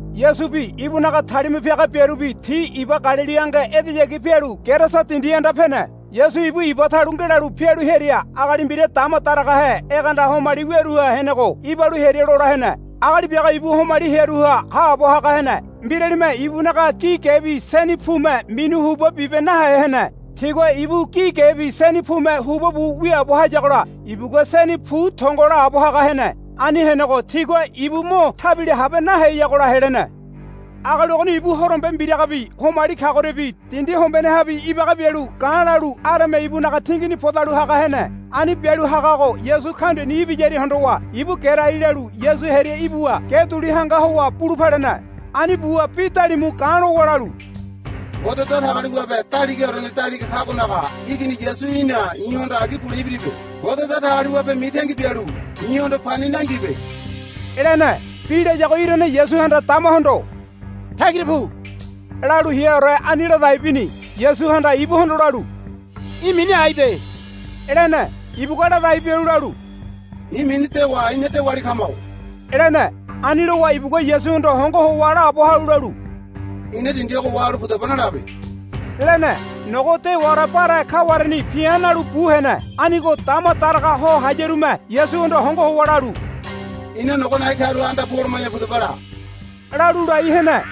Yasubi ibunaga talima piaga biarubi ti iba Galili ange edeyagi pialu Gerasa dindi anda pene. Yasu ibu iba talu ngelalu pialu hearia agali mbira dama daragahe egeanda homali wiaruha henego ibalu hearia lola hene. Agali biago ibu homali hearuha haabo haga hene. Mbiralime ibunaga gi gebi seni pume minu huba bibe nahe hene. Tigua ibu gi gebi seni pume huba bu wiaabo hayagola ibugua seni pu tongo laabo haga hene. Ani henego tigua ibu mo tabila habe naheyagola helene. Agali ogoni ibu horombe mbiragabi homali kagoriabi dindi hombenehabi ibaga bialu ga̱ lalu areme ibunaga tingini podalu haga hene. Ani bialu hagago Yasu kaundiani ibiyaria hondowa ibu gerai lalu Yasu hearia ibuwa ge duli hanga howa bulu palene. Ani buwa bi dalimu ga̱ lowa lalu, Ngode Datagaliwabe Daligaorene Daliga Kagonaga Igini Yasu í̠na i̱hondo agi bule ibiribe. Ngode Datagaliwabe mitangi bialu i̱hondo pani nangibe, lene. Bi layago irane Yasuhanda damahondo, Tagira pu, lalu heaore ani ladai bini. Yasuhanda ibuhondo lalu, Í̠ mini aibe, lene. Ibugua ladai bialu lalu, I̱ mini Dewa ina dewali kamago, lene. Ani lowa ibugua Yasuhondo hongo howa laabo halu lalu, Ina dindi ogo wahalu pudaba nalabe, lene. Nogo dewaore bare kawareni pi̱a̱ nalu bu hene. Anigo dama daraga ho hayarume Yasuhondo hongo howa lalu, Ina nogo na̱i̱ karuha anda pu holoma̱ya pudaba la, lalu lai hene.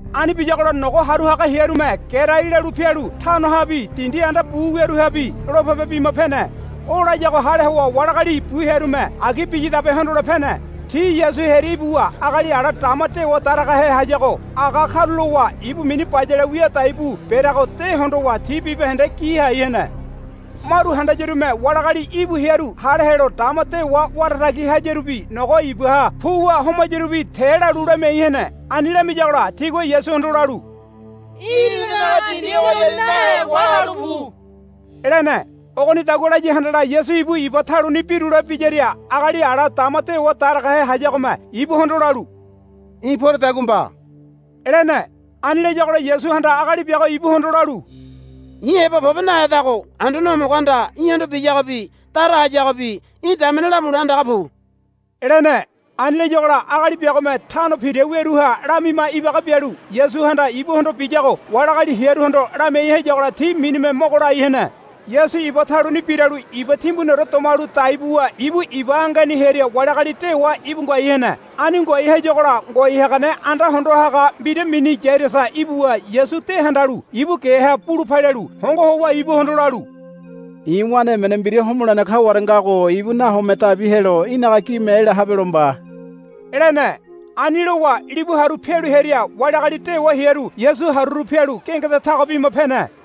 Ani biyagola nogo haru haga hearume gerai lalu pialu tanohabi dindi anda bu wiaruhabi lopebe bima pene. O layago hale howa wali agali bu hearume agi biyadabe hondole pene. Ti Yasu hearia ibuwa agali ala dama dewa daragahe hayago aga karulowa ibu mini bayale wia dai bu bereago de hondowa ti bibahende gi hai hene. Maru handayarume wali agali íbu hearu hale helo dama dewa wara tagi hayarubi nogo ibaha puwa homayarubi te lalu lamiai hene. Ani lamiyagola tigua Yasuhondo lalu, Í̠ inanaga dindi ogoriani nahe wahalu pu, lene. Ogonidagua laya handala Yasu ibu iba taluni birule biyaria agali ala dama dewa daragahe hayagome ibuhondo lalu, Í̠ poredagua mba, lene. Ani layagola Yasuhanda agali biago ibuhondo lalu, I̱ heba pobe nahedago Anduane Homogohanda í̠hondo biyagobi dara hayagobi í̠ damene lamule andaga pu, lene. Ani layagola agali biagome Tano Pira wiaruha lamima ibaga bialu Yasuhanda ibuhondo biyago wali agali hearuhondo lamiai hayagola ti minime mogo lai hene. Yasu iba taluni biralu iba timbuniore domalu dai buwa ibu iba angeni hearia wali agali dewa íbu ngoai hene. Ani ngoai hayagola ngoai hagane anda hondo haga mbira mini Yairasa ibuwa Yasu de handalu ibu geha bulu palialu hongo howa ibuhondo lalu, I̱ wane emene mbira homolene kaware ngago ibu nahome dabi helo í̠naga gime ela habelo mba, lene. Ani lowa libu haru pialu hearia wali agali dewa hearu Yasu haruru pialu gengeda tago bima pene.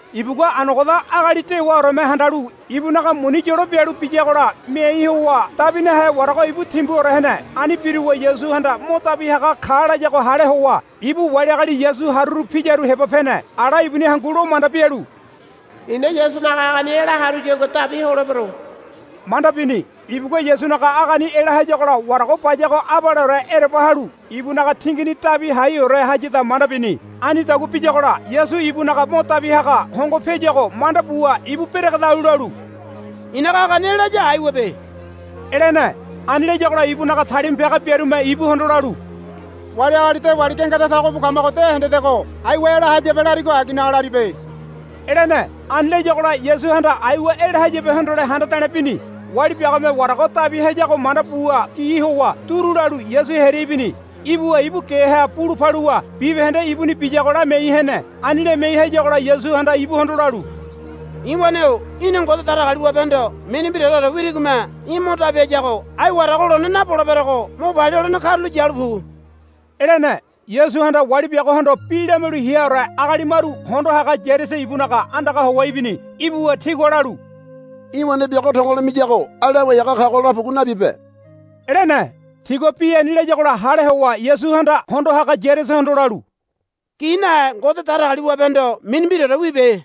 Ibugua anogoda agali dewaoreme handalu ibunaga muni yolo bialu biyagola miai howa dabi nahe warago íbu timbuore hene. Ani biruwa Yasuhanda mo dabi haga ka layago hale howa ibu wali agali Yasu haruru piyaru heba pene. Ala ibuni hangu lo manda bialu, I̱na Yasunaga agani ela haruyagua dabi holebero, manda bini. Ibugua Yasunaga agani ela hayagola warago bayago abaleore ereba halu ibunaga tingini dabi haiore hayada manda bini. Anidagua biyagola Yasu ibunaga mo dabi haga hongo piayuago manda buwa ibu beregedalu lalu, I̱naga agani ela haya aiwabe, lene. Ani layagola ibunaga talima piaga biarume ibuhondo lalu, Wali agali dewali gengeda tago bu kamago de hendedego. Aiwa ela hayabe larigo aginaga laribe, lene. Ani layagola Yasuhanda aiwa ela hayabe hondole handa de̱le̱ bini. Wali biagome warago dabi hayago manda buwa gi howa duru lalu Yasu hearia ibini. Ibuwa ibu geha bulu paluwa bibahende ibuni biyago lamiai hene. Ani lamiai hayagola Yasuhanda ibuhondo lalu, I̱ wane-o í̠na Ngode Datagaliwabehondo mini mbiraore wirigome í̠ mo dabi hayago ai warago lone naboleberego mo palia holene karulo yalu pu, lene. Yasuhanda wali biagohondo bi lamialu heaore agali maru hondo haga Yairasa ibunaga andaga howa ibini. Ibuwa tigua lalu, Í̠ wane biago tongo lo miyago ai Lawai Haga kago la pugu nabibe, lene. Tigua bi ani layagola hale howa Yasuhanda hondo haga Yairasahondo lalu, Gi nahe Ngode Datagaliwabehondo mini mbiraore wibe,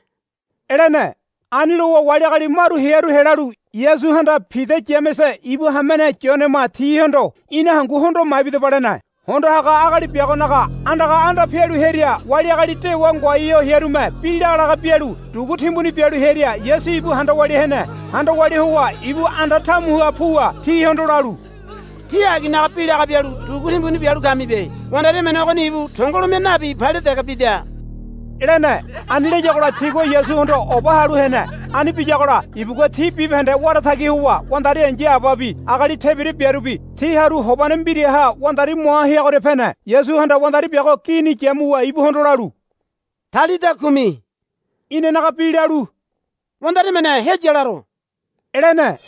lene. Ani lowa wali agali maru hearu helalu Yasuhanda Pida Yamese ibu hamene Yonema tihondo, Ina hangu hondo maibidaba, lene. Hondo haga agali biagonaga andaga anda pialu hearia wali agali dewa ngoai ho hearume bi lagalaga bialu dugu timbuni bialu hearia Yasu ibu handa walia hene. Handa walia howa ibu anda tamuha puwa tihondo lalu, Tí aginaga bi laga bialu dugu timbuni bialu kamibe. Wandari emene ogoni ibu tongolo mia nabi palia dege bida, lene. Ani layagola tigua Yasuhondo oba halu hene. Ani biyagola ibugua ti bibahende wara tagi howa wandari ai̱ya ababi agali tebira biarubi ti haru hobane mbiraha wandari moa heagoria pene. Yasuhanda wandari biago gini yamuwa ibuhondo lalu, Talita kumi, inanaga bi lalu, Wandari emene heya laro, lene.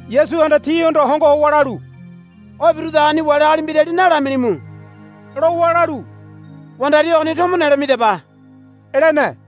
Yasuhanda tihondo hongo howa lalu, O birudagoni wali agali mbirali nalamilimu, lowa lalu, Wandari ogoni tomo nelo midaba, lene.